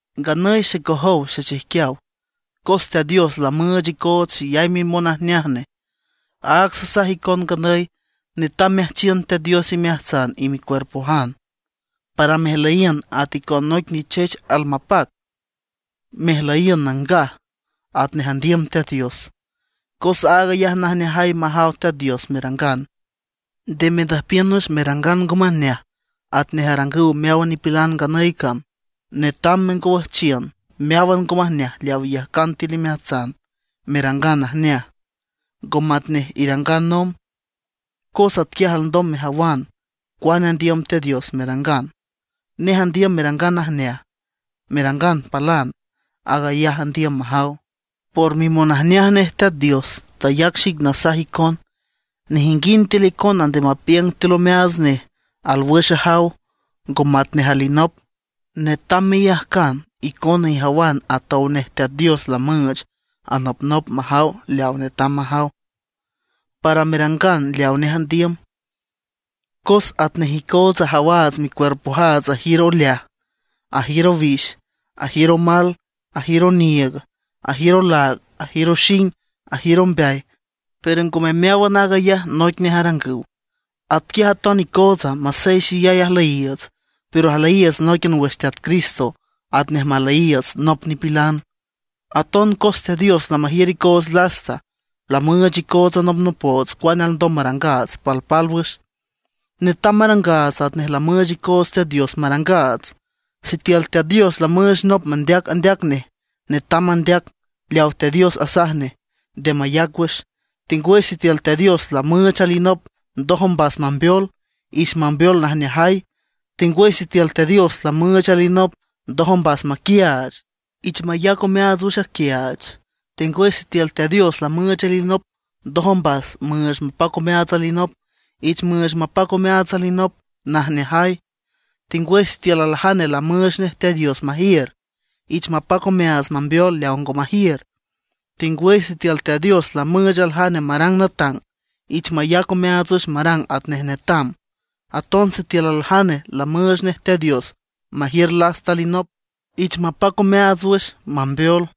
Nganüy xecojow xechijquiaw, cos Teat Dios lamüüch icoots xeyay mimonajneaj nej, áag sasaj icon nganüy netam meajchiün Teat Dios imeajtsan y micuerpojan, para mejlüyiün at icon noic nichech almapac, mejlüyiün nangaj, atnej andiüm Teat Dios. Cos aag ayaj najneajay majaw Teat Dios merangan. Nde mendüjpiün wüx merangan ngo majneaj atnej arangüw meáwan nipilan nganüy cam. Netam mengowüjchiün meáwan ngo majneaj leaw iyajcan tiül imeajtsan, merangan najneaj, ngo matnej irangan nomb. Cos atquiaj alndom mejawan cuane andiüm Teat Dios merangan. Nej andiüm merangan najneaj, merangan palan; aag ayaj andiüm majaw. Por mimonajneaj nej Teat Dios tayac xic nasaj icon: Nejinguind tiül icona nde mapiüng tiül omeaats nej alwüx ajaw ngo matnej alinop. Netam meyajcan icona ijawan atow nej Teat Dios lamüüch anopnop majaw leaw netam majaw, para merangan leawa nej andiüm. Cos atnej icootsa ajawaats, micuerpojaats ajiür oleaj, ajiür owix, ajiür omal, ajiür oniiüg, ajiür olaag, ajiür oxing, ajiür ombeay, pero ngome meáwan aag ayaj noic nej arangüw. Atquiaj aton icootsa, masey xeyay ajlüyiiüts, pero ajlüyiiüts nóiquian wüx Teat Cristo, atnej majlüyiiüts nop nipilan. Aton cos Teat Dios lamajiür icoots lasta, lamüüch icoots anopnopoots cuane alndom marangaats palpálwüx. Netam marangaats atnej lamüüch icoots Teat Dios marangaats. Sitiül Teat Dios lamüüch nop mandeac andeac nej, netam mandeac leaw Teat Dios asaj nej, nde mayac wüx. Tengwüy sitiül Teat Dios lamüüch alinop ndoj ombas mambeol, ich mambeol najneajay. Tengwüy sitiül Teat Dios lamüüch alinop ndoj ombas maquiaach, ich mayac omeaats wüx aquiaach. Tengwüy sitiül Teat Dios lamüüch alinop ndoj ombas müüch mapac omeaats alinop, ich müüch mapac omeaats alinop najneajay. Tengwüy sitiül aljane lamüüch nej Teat Dios majiür, ich mapac omeaats mambeol leaw ngo majiür. Tengwüy sitiül Teat Dios lamüüch aljane marang natang, ich mayac omeaats wüx marang atnej netam. Aton sitiül aljane lamüüch nej Teat Dios majiür lasta alinop, ich mapac omeaats wüx mambeol.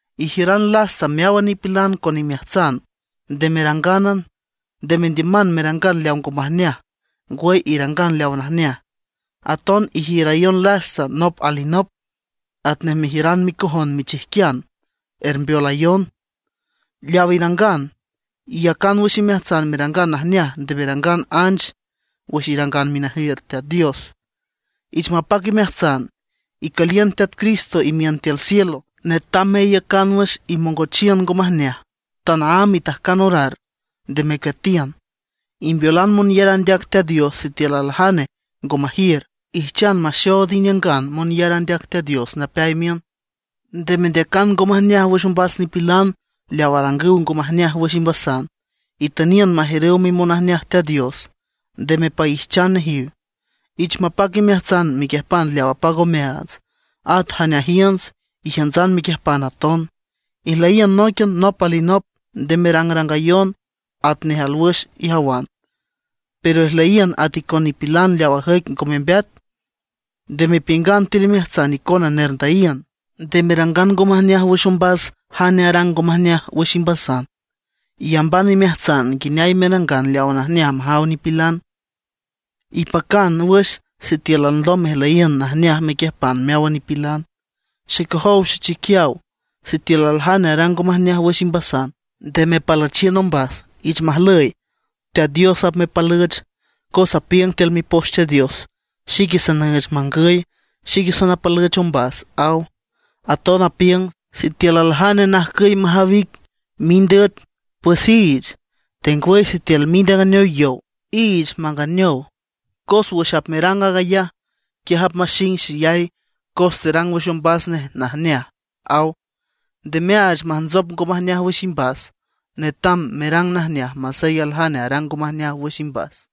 Ijiüran lasta meáwan nipilan con imeajtsan, nde merangánan. Nde mendiüman merangan leaw ngo majneaj, ngwüy irangan leawa najneaj. Aton ijiürayon lasta nop alinop atnej mejiüran micojon michijquian, ermbeolayon. Leaw irangan, iyacan wüx imeajtsan merangan najneaj. Nde merangan anch wüx irangan minajiüt Teat Dios. Ich mapac imeajtsan, icüliün Teat Cristo imiün tiül cielo. Netam meiücan wüx imongochiün ngo majneaj, tanaámb itajcan orar, nde mecueatiün. Imbeolan monyar andeac Teat Dios sitiül aljane ngo majiür. Ijchan maxood iniüngan monyar andeac Teat Dios napeay miün. Nde mendeacan ngo majneaj wüx ombas nipilan leaw arangüw ngo majneaj wüx imbasan, itüniün majiürüw mimonajneaj Teat Dios, nde mepaijchan nejiw. Ich mapac imeajtsan mequiüjpan leaw apac omeaats, at jane ajiünts, ijiüntsan mequiüjpan aton. Ijlüyiün nóiquian nop alinop, nde merangrangayon atnej alwüx ijawan, pero ijlüyiün at icon nipilan leaw ajüic ngo membeat. Nde mepiüngan tiül imeajtsan icona nerndüyiün. Nde merangan ngo majneaj wüx ombas jane arang ngo majneaj wüx imbasan; iyamban imeajtsan nguineay merangan leaw najneaj majaw nipilan. Ipacan wüx sitiül alndom mejlüyiün najneaj mequiüjpan meáwan nipilan. Xecojow xechijquiaw, sitiül aljane arang ngo majneaj wüx imbasan, nde mepalüchiün ombas. Ich majlüy, Teat Dios apmepalüch. Cos apiüng tiül Mipoch Teat Dios: “Xique sanüüch mangüy, xique sanapalüch ombas”, aw. Aton apiüng: “Sitiül aljane najcüy majaw ic mind üet, pues iich; tengwüy sitiül mind anganeow yow, iich manganeow. Cos wüx apmerang aag ayaj, quiaj apmaxing xeyay cos terang wüx ombas najneaj”, aw. Nde meaach majntsop ngo majneaj wüx imbas; netam merang najneaj masey aljane arang ngo majneaj wüx imbas.